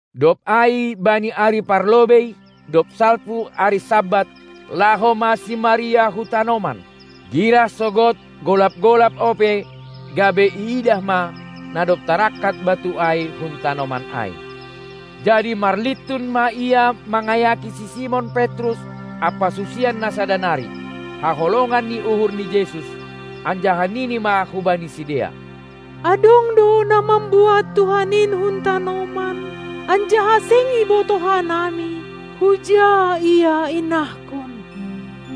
Dob ai bani ari parlobei, dob salpu ari Sabat, laho ma si Maria hu tanoman, girah sogod, golap-golap ope, gabe iidah ma, na dob tarangkat batu ai hun tanoman ai. Jadi marlintun ma ia mangayaki si Simon Petrus ampa susian na sada nari, haholongan ni uhur ni Jesus, anjaha nini ma hubani sidea: Adong do na mambuat Tuhan in hun tanoman, anjaha seng ibotoh hanami, huja Ia inahkon!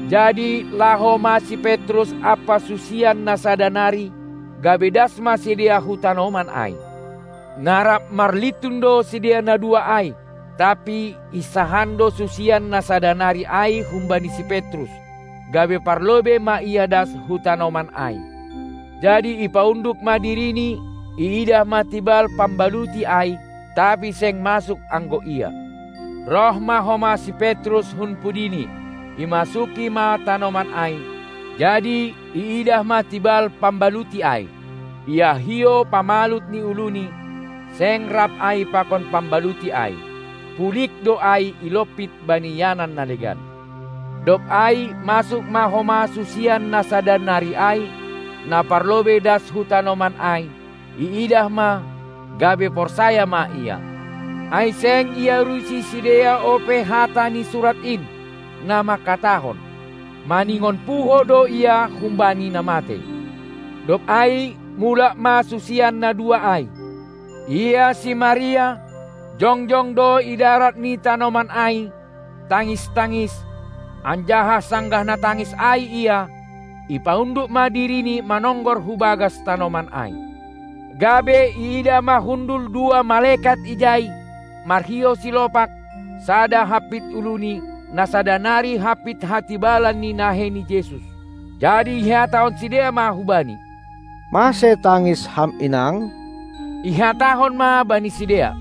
Jadi laho ma si Petrus ampa susian na sada nari, gabe das ma sidea hu tanoman ai. Na rap marlintun do sidea na dua ai, tapi hinsahan do susian na sada nari ai humbani si Petrus, gabe parlobei ma ia das hu tanoman ai. Jadi ipaunduk ma dirini, iidah ma tibal pambaluti ai, tapi seng masuk anggo ia. Roh ma homa si Petrus hun pudini, imasuki ma tanoman ai, jadi iidah ma tibal pamaluti ai. Ia hiou pamalut ni uluNi, seng rap ai pakon pambaluti ai, pulig do ai ilompit bani ianan na legan. Dob ai masuk ma homa susian na sada nari ai, na parlobei das hu tanoman ai, iidah ma, gabe porsaya ma ia. Ai seng iarusi sidea ope hata ni Surat in, na mangkatahon: Maningon puho do Ia humbani na matei. Dob ai mulak ma susian na dua ai. Ia si Maria, jongjong do idarat ni tanoman ai, tangis-tangis, anjaha sanggah na tangis ai ia, ipaunduk ma dirini manonggor hu bagas tanoman ai. Gabe iidah ma hundul dua malekat ijai, marhiou silopak, sada hampit uluNi, na sada nari hampit hatibalan ni nahei ni Jesus. Jadi ihatahon sidea ma hubani: Mase tangis ham inang? Ihatahon ma bani sidea: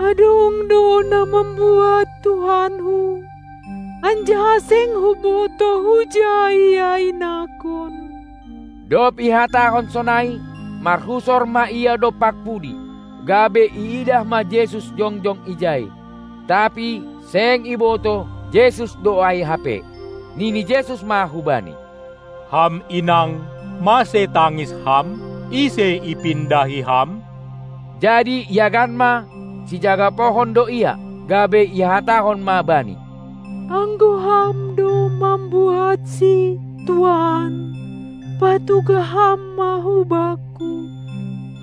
Adong do na mambuat Tuhanku, anjaha seng hubotoh huja Ia inahkon. Dob ihatahon sonai, marhusor ma ia dompak pudi, gabe iidah ma Jesus jongjong ijai, tapi seng ibotoh Jesus do ai hape. Nini Jesus ma hubani: Ham inang, mase tangis ham? Ise ipindahi ham? Jadi iagan ma, sijaga pohon do Ia, gabe ihatahon ma Bani: Anggo ham do mambuatSi, tuan, patugah ham ma bakku,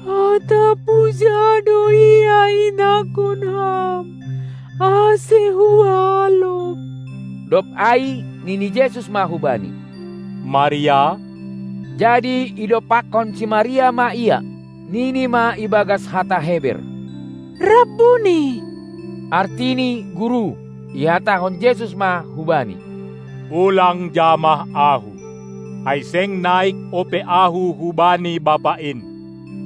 atap huja do Ia inahkon ham, ase hualop! Dob ai nini Jesus ma hubani: Maria! Jadi idompakkon si Maria ma Ia, nini ma ibagas hata Heber: Rabbuni! (artini: Guru.) Ihatahon Jesus ma hubani: Ulang jamah Ahu, ai seng naik ope Ahu hubani Bapa in!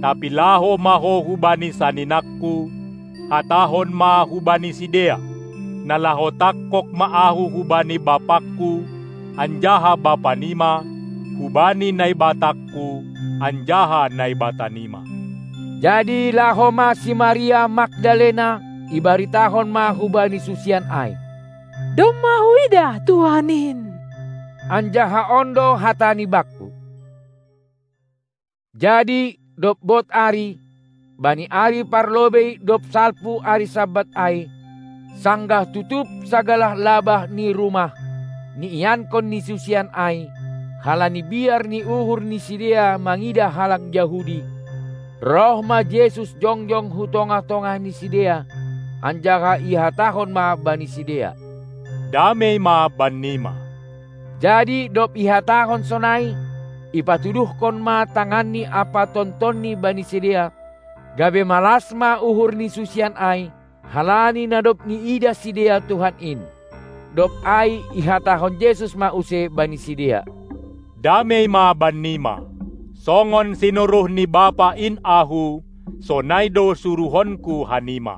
Tapi laho ma ho hubani saninangKu, hatahon ma hubani sidea: Na laho tangkog ma Ahu hubani BapangKu anjaha Bapa nima, hubani NaibatangKu anjaha Naibata nima. Jadi laho ma si Maria Magdalena, ibaritahon ma hubani susian ai: Domma huidah Tuhan in, anjaha on do hatani bakku! Jadi dob bod ari, bani ari parlobei dob salpu ari Sabat ai, sanggah tutup sagala labah ni rumah, niiankon ni susian ai, halani biar ni uhur ni sidea mangidah halak Jahudi, roh ma Jesus jongjong hu tongah-tongah ni sidea, anjaha ihatahon ma bani sidea: Damei ma bannima! Jadi dob ihatahon sonai, ipatuduhkon ma tanganNi ampa tontonNi bani sidea, gabe malas ma uhur ni susian ai, halani na dob iidah sidea Tuhan in. Dob ai ihatahon Jesus ma use bani sidea: Damei ma bannima! Songon sinuruh ni Bapa in Ahu, sonai do suruhonKu hanima!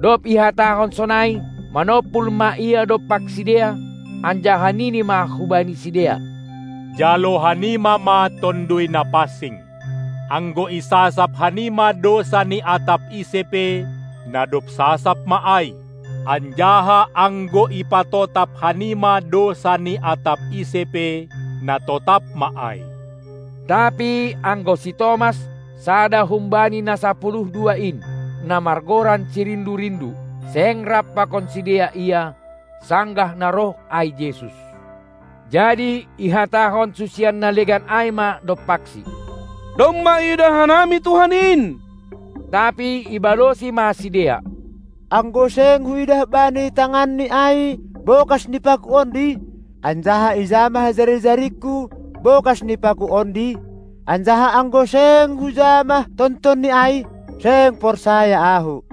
Dob ihatahon sonai, manompul ma Ia dompak sidea, anjaha nini ma Hubani sidea: Jalo hanima ma Tonduy Na pansing! Anggo isasap hanima dousa ni atap ise pe, na dob sasap ma ai, anjaha anggo ipatotap hanima dousa ni atap ise pe, na totap ma ai. Tapi anggo si Tomas, sada humbani na sapuluh dua in, na margoran si Rindu-rindu, seng rap pakon sidea ia, sanggah na roh ai Jesus. Jadi ihatahon susian na legan ai ma dompaksi: Domma iidah hanami Tuhan in! Tapi ibalosi ma sidea: Anggo seng huidah bani tanganNi ai bokas ni paku ondi, anjaha ijamah jari-jaringku bokas ni paku ondi, anjaha anggo seng hujamah tontonni ai, seng porsaya ahu.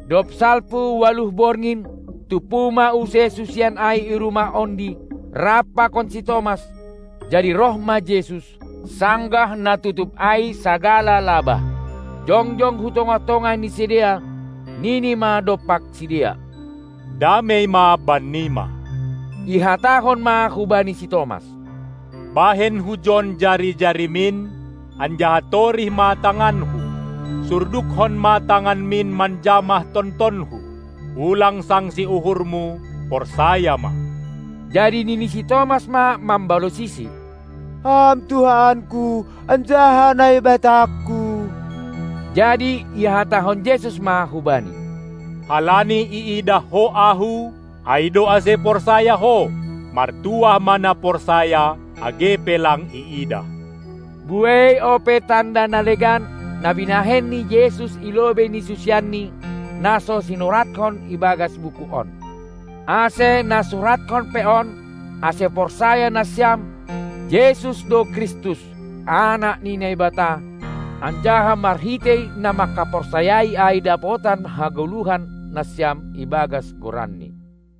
Dob salpu ualuh borngin, tumpu ma use susian ai i rumah ondi, rap pakon si Tomas. Jadi roh ma Jesus, sanggah na tutup ai sagala labah, jongjong hu tongah-tongah ni sidea, nini ma dompak sidea: Damei ma bannima! Ihatahon ma hubani si Tomas: Bahen hujon jari-jarimin, anjaha torih ma tanganKu! Surdukkon ma tanganmin, manjamah tontonHu. Ulang sangsi uhurmu, porsaya ma! Jadi nini si Tomas ma mambalosiSi: Ham Tuhanku anjaha Naibatangku! Jadi ihatahon Jesus ma hubani: Halani iidah ho Ahu, ai do ase porsaya ho. Martuah ma na porsaya, age pe lang iidah! Buei ope tanda na legan, na binahen ni Jesus i lobei ni susianNi, na so sinuratkon ibagas buku on. Ase na suratkon pe on, ase porsaya nasiam, Jesus do Kristus, Anak ni Naibata, anjaha marhitei na mangkaporsayai ai dapotan hagoluhan nasiam ibagas GoranNi.